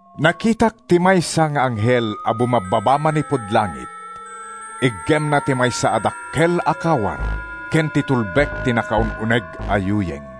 Nakitak ti maysa nga anghel a bumabbaba manipud langit. Iggemna ti maysa a dakkel a kawar ken ti tulbek ti nakaun-uneg a yuyeng.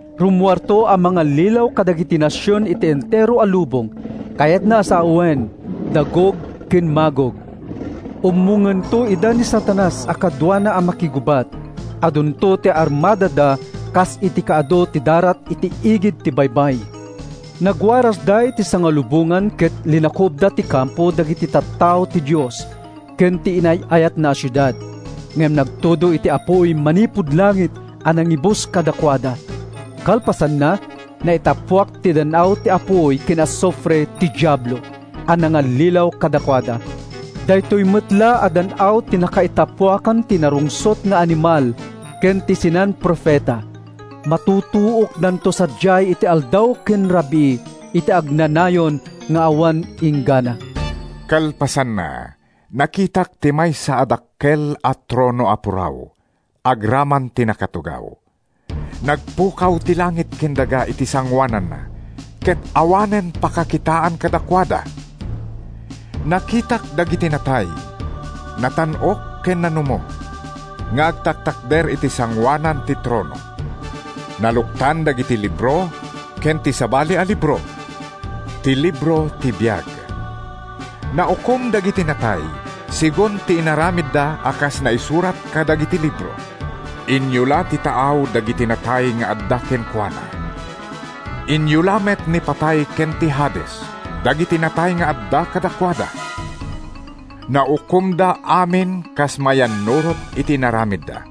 Rummuarto a mangallilaw kadagiti nasion iti entero a lubong, kayatna a sawen, da Gog ken Magog. Ummongento ida ni Satanas a kaduana a makigubat. Adunto ti armadada kas iti kaadu ti darat iti igid ti baybay. Nagwarasda iti sangalubongan ket linakubda ti kampo dagiti tattao ti Dios ken ti inay-ayatna a siudad. Ngem nagtudo iti apuy manipud langit a nangibus kadakuada. Kalpasanna, naitappuak iti dan-aw ti apuy ken asufre ti Diablo a nangallilaw kadakuada. Daytoy met la a dan-aw ti nakaitappuakan ti narungsot nga animal ken ti sinan-profeta. Matutuokdanto sadiay iti aldaw ken rabii, iti agnanayon nga awan inggana. Kalpasanna, nakitak ti maysa a dakkel a trono a puraw agraman ti nakatugaw. Nagpukaw ti langit ken daga iti sangoananna ket awanen pakakitaan kadakuada. Nakitak dagiti natay, natan-ok ken nanumo, nga agtatakder iti sangoanan ti trono. Naluktan dagiti libro ken ti sabali a libro, ti libro ti biag. Naukom dagiti natay segun ti inaramidda a kas naisurat kadagiti libro. Inyula ti taaw dagiti natay nga adda kenkuana. Inyula met ni Patay ken ti Hades dagiti natay nga adda kadakuada. Naukomda amin kas mayannurot iti inaramidda.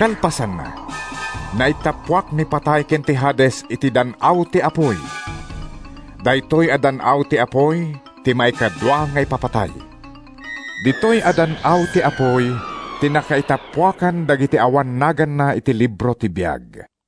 Kalpasanna, naitappuak ni Patay ken ti Hades iti dan-aw ti apuy. (Daytoy a dan-aw ti apuy ti maikadua nga ipapatay.) Ditoy a dan-aw ti apuy ti nakaitappuakan dagiti awan naganna iti libro ti biag.